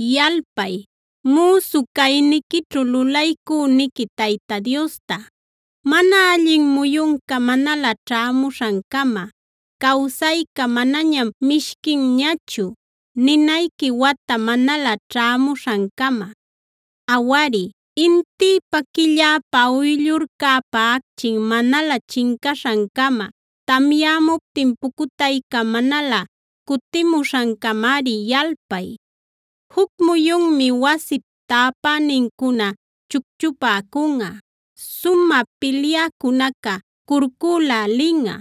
Yalpay, müsu cayniquićhu lulaycüniqui Tayta Diosta, mana allin muyunca manalä ćhämuśhancama, “cawsayca manañam mishquinñachu” ninayqui wata manalä ćhämuśhancama. Awari, intïpa, quilläpa, uyllurcäpa acchin manalä chincaśhancama, tamyämuptin pucutayca manalä cutimuśhancamari yalpay. Juc muyunmi wasip täpänincuna chucchupäcunꞌa; sumä pilyäcunaca curculälinꞌa,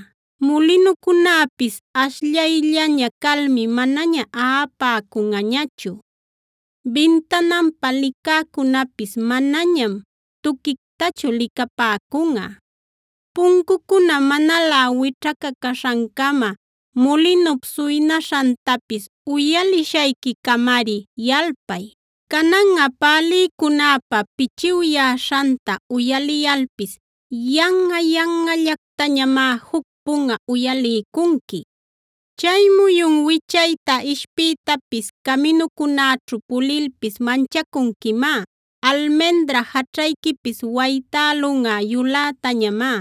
mulinucunäpis ashllayllaña calmi manaña aꞌapäcunꞌachu;a bintananpa licäcunäpis manañam tuquictachu licapäcunꞌa. Puncucuna manalä wićhacacaśhancama, mulinup suynaśhantapis uyalishayquicamari yalpay. Cananꞌa pälïcunäpa pïchiwyäśhanta uyaliyalpis yanꞌa-yanꞌallactañamá juc punꞌa uyaliycunqui. Chay muyun wichayta ishpiytapis, caminucunäćhu pulilpis manchacunquimá; almendra jaćhayquipis waytälunꞌa yulätañamá;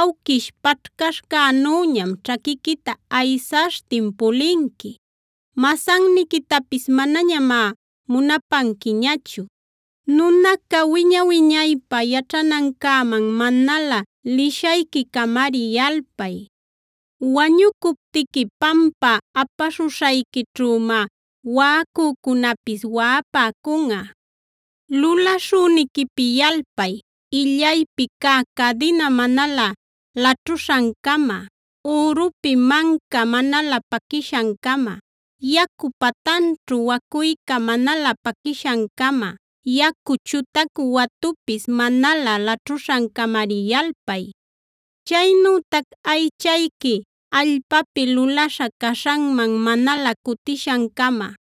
awquish paćhcaśhcänüñam ćhaquiquita aysaśhtin pulinqui; masanniquitapis manañamá munapanquiñachu. Nunaca wiña-wiñaypä yaćhanancäman manalä lishayquicamari yalpay; wañucuptiqui pampä apaśhuśhayquićhümá waꞌacücunäpis waꞌapäcunꞌa. Lulaśhüniquipi yalpay illaypi cä cadina manalä laćhuśhancama, ürupi manca manalä paquishancama, yacu patanćhu wacuyca manalä paquishancama; yacu chutacu watupis manalä laćhuśhancamari yalpay. Chaynütac aychayqui allpapi lulaśha caśhanman manalä cutishancama,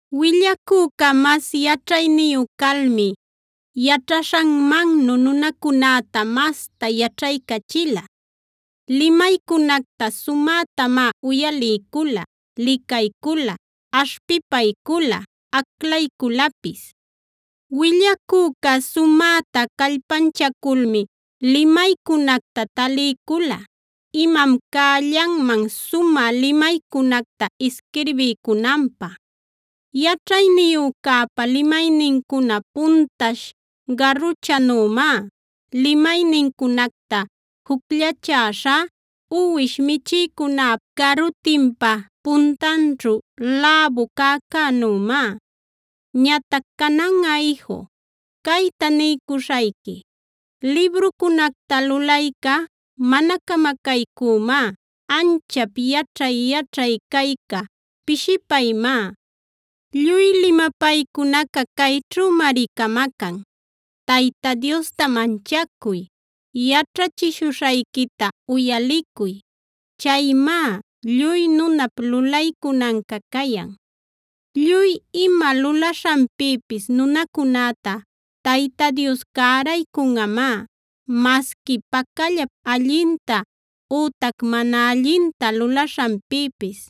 Willacüca mas yaćhayniyu calmi yaćhaśhanmannu nunacunäta masta yaćhaycachila. Limaycunacta sumätamá uyaliycula, licaycula, aśhpipaycula, aclayculapis. Willacüca sumäta callpanchaculmi limaycunacta taliycula imam cällanman sumä limaycunacta isquirbiycunanpä. Yaćhayniyücäpa limaynincuna puntash garuchanümá; limaynincunacta jucllachäśhá uwish michïcunäpa garutinpa puntanćhu läbu cäcänümá. Ñatac cananꞌa iju, cayta niycuśhayqui: Librucunacta lulayca mana camacaycuymá; anchap yaćhay-yaćhay cayca pishipaymá. Lluy limapaycunaca cayćhümari camacan: Tayta Diosta manchacuy; yaćhachishuśhayquita uyalicuy. Chaymá lluy nunap lulaycunanca cayan. Lluy ima lulaśhanpïpis nunacunäta Tayta Dios cäraycunꞌamá masqui pacallap allinta ütac mana allinta lulaśhanpïpis.